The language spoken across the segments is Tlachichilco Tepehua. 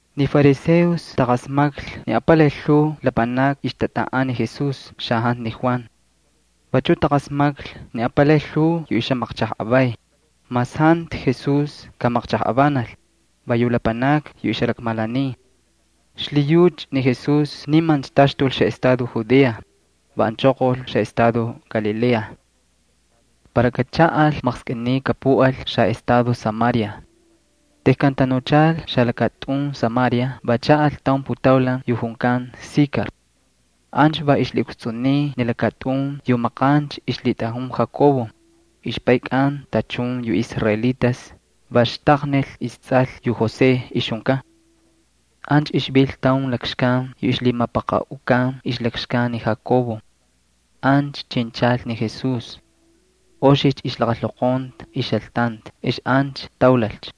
Ni fariseos taqasmaklhi ni apalay lhuu lapanakni ixtatꞌaꞌan ni Jesús xajantu ni Juan. Vachuꞌ taqasmaklhi ni apalay lhuu yu ixjamaqchajꞌavay, mas jantu Jesús kamaqchajꞌavanal, va yu lapanakni yu ixjalakmalaniy. Xlhiyucha ni Jesús nimancha taxtul xaꞌestado Judea, va anchoqolcha xaꞌestado Galilea. Para kachaꞌal maqskꞌiniy kapuꞌal xaꞌestado Samaria. Tejkan tanuchal xalakatꞌun Samaria va chaꞌal taun putaulan yu junkan Sikar. Ancha va ixlhiꞌukstsꞌuniy ni lakatꞌun yu maqancha ixlhitꞌajun Jacob, ixpaykꞌan tachun yu israelitas, va xtaqnil istsꞌal yu José ixjunkan. Ancha ixvil taun lakxkan yu ixlhimapaqaꞌukan ixlakxkan ni Jacob. Ancha chinchal ni Jesús. Oxicha ixlaqalhoqonta ixjaltanti ex ancha taulalcha.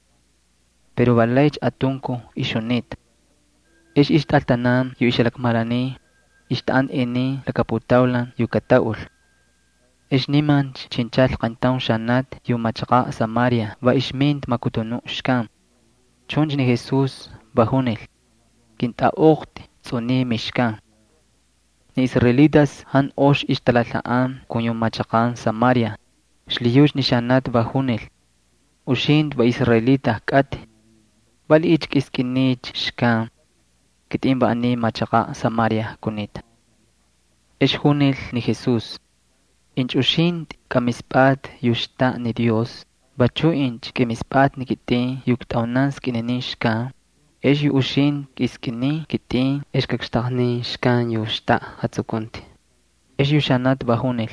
Pero va laycha atunkuj ixjunita. Ex ixtꞌaltanan yu ixjalakmalaniy, ixtaꞌanta inin laka putaulan yu kataꞌul. Ex nimancha chinchal qayntaun xanati yu machaqaꞌ Samaria va ixminta makutunuꞌ xkan. Chuncha ni Jesús va junil: —Kꞌintꞌaꞌoqtꞌi tsꞌuniy mixkan. Ni israelitas jantu ox ixtalalhaꞌan kun yu machaqan Samaria, xlhiyucha ni xanati va junil: —Uxintꞌi va israelita kꞌatꞌi. ¿Valiꞌiycha kꞌiskꞌiniycha xkan? Kitꞌin va aniy machaqaꞌ Samaria kunita. Ex junil ni Jesús: —Incha uxintꞌi kꞌamispꞌatꞌi yu xtaꞌa ni Dios, vachuꞌ incha kꞌimispꞌatꞌi ni kitꞌin yu iktꞌaunan skꞌininin xkan, ex yu uxintꞌi kꞌiskꞌinin kitꞌin ex kakxtaqnin xkan yu xtaꞌa jatsukunti. Ex yu xanati va junil: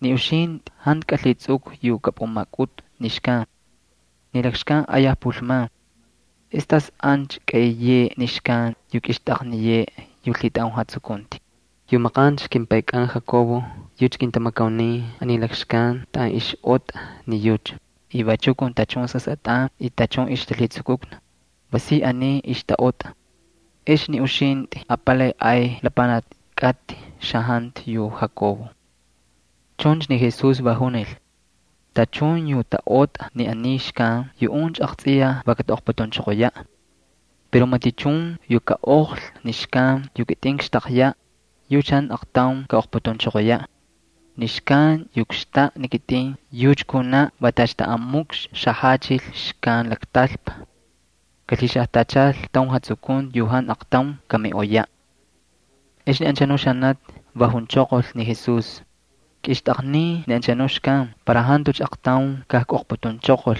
—Ni uxintꞌi jantu kꞌalhitsꞌukꞌu yu kꞌapꞌumakꞌutꞌu ni xkan. Ni lakxkan ayaj pulman. ¿Ex tas ancha kaꞌiyeꞌe ni xkan yu kꞌixtꞌaqniyeꞌe yu lhitꞌajun jatsukunti? Yu maqancha kimpaykꞌan Jacob yucha kintamakaunin aniy lakxkan taꞌan ixꞌotꞌa ni yucha, y vachu kun tachun sasꞌatꞌan y tachun ixtalhitsukukna, va si aniy ixtaꞌotꞌa. ¿Ex ni uxintꞌi apalaycha ay lapanaki kꞌatꞌi xajantu yu Jacob? Chuncha ni Jesús va junil: —Tachun yu taꞌotꞌa ni aniy xkan yuꞌuncha aqtsꞌiyaj va kataꞌoqputunchoqoyaꞌ. Pero matichun yu kaꞌoqlhi ni xkan yu kitꞌin kakxtaqyaꞌ, yucha jantucha aqtaun kapukikxixaꞌ. Ni xkan yu kxtaꞌa ni kitꞌin yucha kunaꞌ va tacha taꞌan mukxi xajachil xkan laktalpa. Kalhixajtachal taun jatsukunti yu jantu aqtaun kamiꞌoyaꞌ. Ex ni anchanuꞌ xanati va junchoqol ni Jesús: —Kꞌixtꞌaqnin ni anchanuꞌ xkan para jantucha aqtaun kajkꞌoqputunchoqol,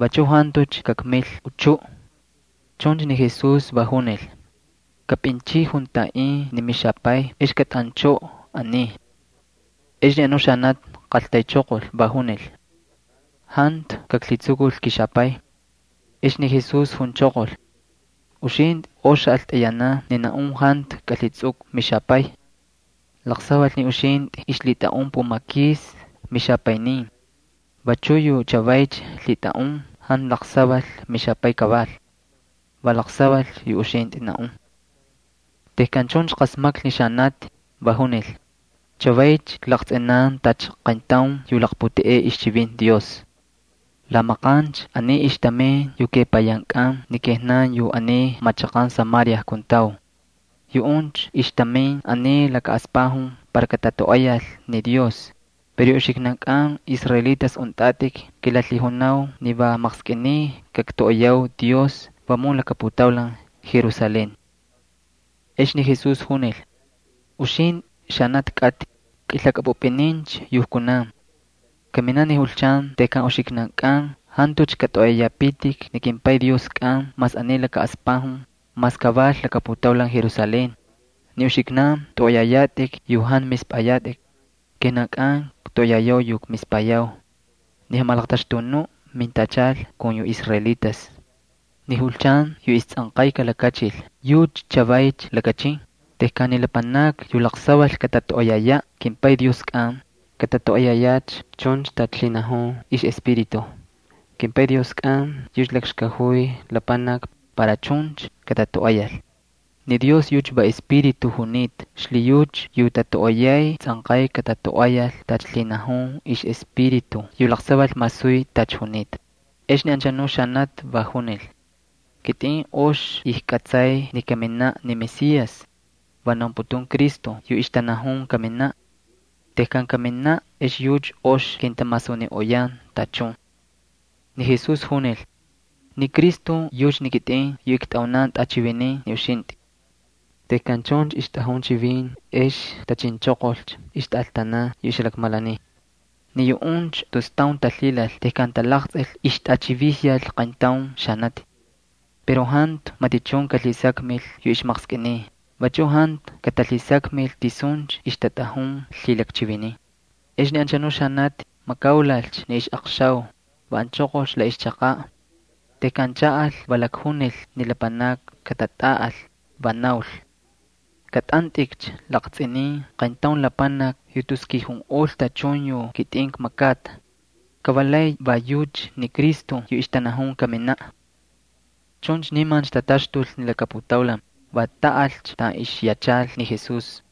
vachu jantucha kakmil uchuꞌ. Chuncha ni Jesús va junil: —Kꞌapꞌinchꞌiy juntaꞌin ni mixapay ex kꞌatꞌanchꞌoꞌo aniy. Ex ni anu xanati qaltaychoqol, va junil: —Jantu kaklhitsukul kixapay. Ex ni Jesús junchoqol: —Uxintꞌi ox xaꞌaltꞌayanan ni naꞌun jantu kꞌalhitsꞌukꞌu mixapay. Laqsaval ni uxintꞌi ixlhitꞌaꞌun pumakis mixapaynin. Vachu yu chavaycha lhitꞌaꞌun jantu laqsaval mixapay kaval. Va laqsaval yu uxintꞌi naꞌun. Tejkan chuncha qasmaklhi ni xanati, va junil: —Chavaycha klaqtsꞌinan tacha qayntaun yu laqputeꞌey ixchivinti Dios. La maqancha aniy ixtamin yu kepayankꞌan ni kijnan yu aniy machaqan Samaria kuntau. Yuꞌuncha ixtamin aniy laka aspajun para katatoꞌoyal ni Dios. Pero yu uxiknankꞌan israelitas untꞌatꞌik kilalhijunau ni va maqskꞌiniy kaktoꞌoyau Dios vamun laka putaulan Jerusalén. Ex ni Jesús junil: —Uxintꞌi, xanati kꞌatꞌi, kꞌilhakꞌapꞌupꞌinincha yu kunan. Kaminaꞌ ni julchan tejkan uxiknankꞌan jantucha katꞌoꞌoyayapitik ni kimPay Dioskꞌan mas aniy laka aspajun, mas kaval laka putaulan Jerusalén. Ni uxiknan tꞌoꞌoyayatꞌik yu jantu mispꞌayatꞌik. Kijnankꞌan ktoꞌoyayau yu kmispayau. Ni Jamalaqtaxtunuꞌ mintachal kun yu israelitas. Ni julchan yu istsꞌanqay kalakachil yucha chavaycha lakachin, tejkan ni lapanakni yu laqsaval katatoꞌoyayaꞌ kimPay Dioskꞌan, katatoꞌoyayacha chuncha tacha lhinajun ixꞌEspíritu. KimPay Dioskꞌan yucha lakxkajuy lapanakni para chuncha katatoꞌoyal. Ni Dios yucha va Espíritu junita xlhiyucha yu tatoꞌoyay tsꞌanqay katatoꞌoyal tacha lhinajun ixꞌEspíritu yu laqsaval masuy tacha junita. Ex ni anchanuꞌ xanati va junil: —Kitꞌin ox ijkꞌatsay ni kaminaꞌ ni Mesías (va naunputun Cristo yu ixtanajun kaminaꞌ). Tejkan kaminaꞌ ex yucha ox kintamasuniꞌoyan tachun. Ni Jesús junil: —Va yucha ni kitꞌin yu ktꞌaunan tꞌachivinin ni uxintꞌi. Tejkan chuncha ixtꞌajun chivin ex tachinchoqolcha ixtꞌaltanan yu ixjalakmalaniy. Ni yuꞌuncha tus taun talhilal tejkan talaqtsꞌil ixtꞌachivijyal qayntaun xanati. Pero jantu matichun kalhisakmil yu ixmaqskꞌiniy, vachu jantu katalhisakmil tisuncha ixtatꞌajun lhilakchivinin. Ex ni anchanu xanati makaulalcha ni ixꞌaqxau, va anchoqolcha la ixchaqaꞌ. Tejkan chaꞌal va lakjunil ni lapanakni katatꞌaꞌal, va naul: —Kꞌatꞌantꞌikcha laqtsꞌinin qayntaun lapanaki yu tus kijunꞌol tachun yu kitꞌin kmakata. Ka va lay va yucha ni Cristo yu ixtanajun kaminaꞌ. Chuncha nimancha tataxtul ni laka putaulan, va taꞌalcha taꞌan ixyachal ni Jesús.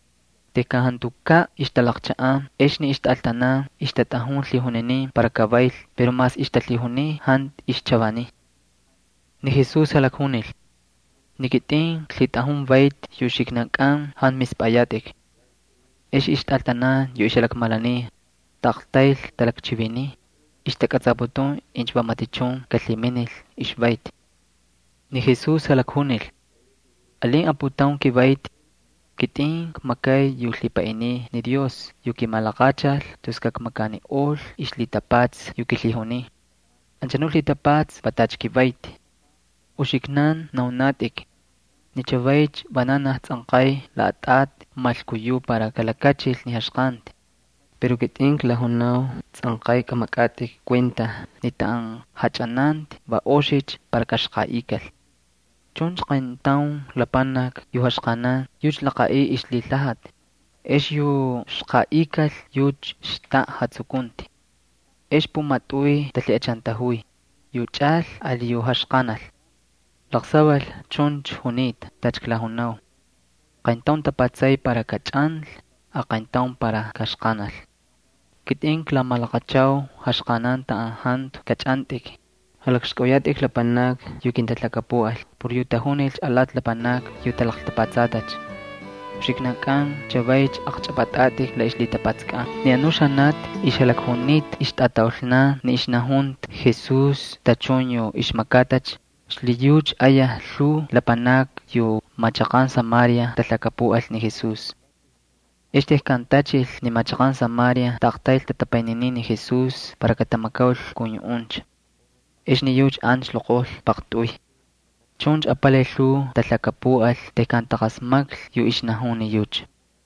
Tejkan jantukaꞌ ixtalaqchaꞌan ex ni ixtꞌaltanan ixtatꞌajun lhijuninin para kavayl pero mas ixtalhijuniy jantu ixchavaniy. Ni Jesús jalakjunil: —Ni kitꞌin klhitꞌajun vayti yu uxiknankꞌan jantu mispꞌayatꞌik. Ex ixtꞌaltanan yu ixjalakmalaniy, taꞌaqtayl talakchiviniy, ixtakꞌatsaputun incha va matichun kalhiminil ixvayti. Ni Jesús jalakjunil: —Alin aputaun kivayti. Kitꞌin kmakay yu lhipaꞌiniy ni Dios yu kimalaqachal tus kakmakaniꞌol ixlhitapatsa yu kilhijuniy. Anchanu lhitapatsa va tacha kivayti. Uxiknan naunatꞌik: “Ni chavaycha vananaj tsꞌanqay laꞌatꞌati malkuyuꞌ para kalakachil ni jaxqanti.” Pero kitꞌin klajunau tsꞌanqay kꞌamakꞌatꞌik kuenta ni taꞌan jachꞌananti va oxicha para kaxqaꞌikal. Chuncha qayntaun lapanaki yu jaxqanan yucha laqaꞌiy ixlhilhajati, ex yu xqaꞌikal yucha xtaꞌa jatsukunti. Ex pumatꞌuy talhiꞌachantajuy, yu chꞌal ali yu jaxqanal. Laqsaval chuncha junita tacha klajunau: “Qayntaun tapatsay para kachꞌanlhi, aqayntaun para kaxqanal.” Kitꞌin klamalaqachau jaxqanan taꞌan jantu kachꞌantꞌik. Jalakxkꞌauyatꞌik lapanakni yu kintalhakapuꞌal por yu tajunilcha alati lapanakni yu talaqtapatsatacha. Uxiknankꞌan chavaycha aqchꞌapꞌatꞌatꞌik la ixlhitapatsakꞌan. Ni anu xanati ixjalakjunita ixtꞌamachaqan ni ixnajunta Jesús tachun yu ixmakatacha, xlhiyucha ayaj lhuu lapanakni yu machaqan Samaria talhakapuꞌal ni Jesús. Ex tejkan tachil ni machaqan Samaria taꞌaqtayl tatapayniniy ni Jesús para katamakaul kun yuꞌuncha. Ex ni yucha ancha loqojlhi paqtꞌuy. Chuncha apalay lhuu talhakapuꞌal tejkan taqasmaklhi yu ixnajun ni yucha.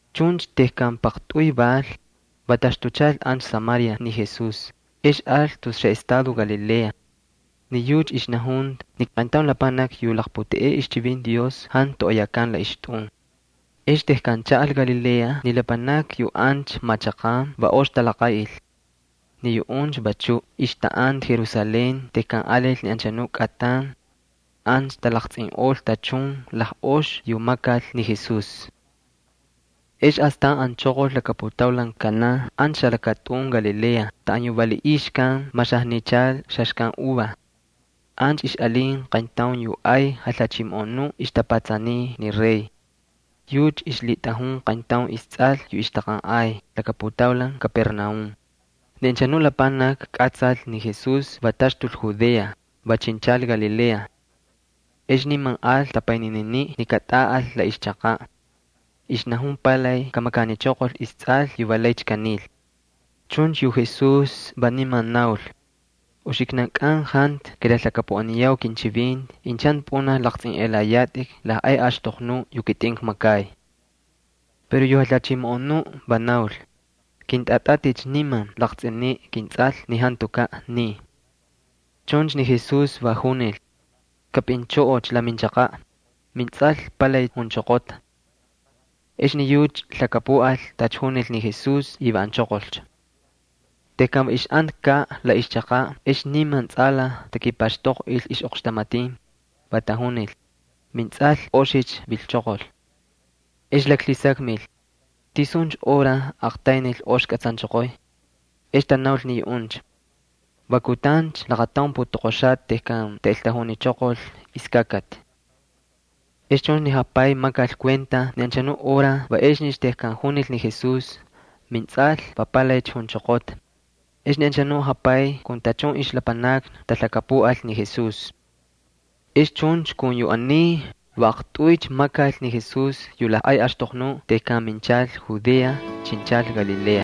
Chuncha tejkan paqtꞌuy val, va taxtuchal ancha Samaria ni Jesús, ex al tus xaꞌestado Galilea. Ni yucha ixnajunta ni qayntaun lapanaki yu laqputeꞌey ixchivinti Dios jantu toꞌoyakan la ixtꞌun. Ex tejkan chaꞌal Galilea ni lapanakni yu ancha machaqan va ox talaqaꞌil. Ni yuꞌuncha vachuꞌ ixtaꞌanta Jerusalén tejkan alil ni xakꞌatan Paxku. Ancha talaqtsꞌinꞌol tachun lajꞌox yu makal ni Jesús. Ex astan anchoqol laka putaulan Caná ancha xalakatꞌun Galilea taꞌan yu valiꞌiy xkan maxajnichal xaxkan uva. Ancha ixꞌalin qayntaun yu ay jalhachimoꞌonu yu ixtapatsaniy ni rey. Yucha ixlhitꞌajun qayntaun istsꞌal yu ixtaqanꞌay laka putaulan Capernaúm. Ni anchanu lapanaki kꞌatsal ni Jesús va taxtul Judea, va chinchal Galilea. Ex niman al tapaynininiꞌ ni katꞌaꞌal la ixchaqaꞌ. Ixnajun palay kamakanichoqol istsꞌal yu va laycha kanil. Chuncha yu Jesús va niman naul: —Uxiknankꞌan jantu kilalhakapuꞌaniyau kinchivinti incha jantu pꞌunaj laqtsꞌinꞌelayatꞌik lajꞌay axtoqnu yu kitꞌin kmakay. Pero yu jalhachimoꞌonuꞌ va naul: —Kꞌintꞌatꞌatꞌicha niman laqtsꞌiniꞌ kintsꞌal ni jantukaꞌ niy. Chuncha ni Jesús va junil: —Kꞌapꞌinchꞌoꞌocha la minchaqaꞌ, mintsꞌal palay junchoqota. Ex ni yucha lhakapuꞌal tacha junil ni Jesús y va anchoqolcha. Tejkan va ixꞌantakaꞌ la ixchaqaꞌ ex takipaxtoqꞌil ixꞌoqxtamatin, va tajunil: —Mintsꞌal oxicha vilchoqol. Ex laklhisakmil: —¿Tisuncha hora aqtaynil ox kꞌatsanchoqoy? Ex tanaul ni yuꞌuncha: —Va kutancha laqataun putoqoxata tejkan taꞌeltajunichoqol iskakati. Ex chuncha ni japay makal kuenta ni anchanu hora va exnicha tejkan junil ni Jesús: “Mintsꞌal va palaycha junchoqota.” Ex ni anchanu japay kun tachun ixlapanakni talhakapuꞌal ni Jesús. Ex chuncha kun yu aniy, va aqtꞌuycha makal ni Jesús yu lajꞌay axtoqnuꞌ tejkan minchal Judea, chinchal Galilea.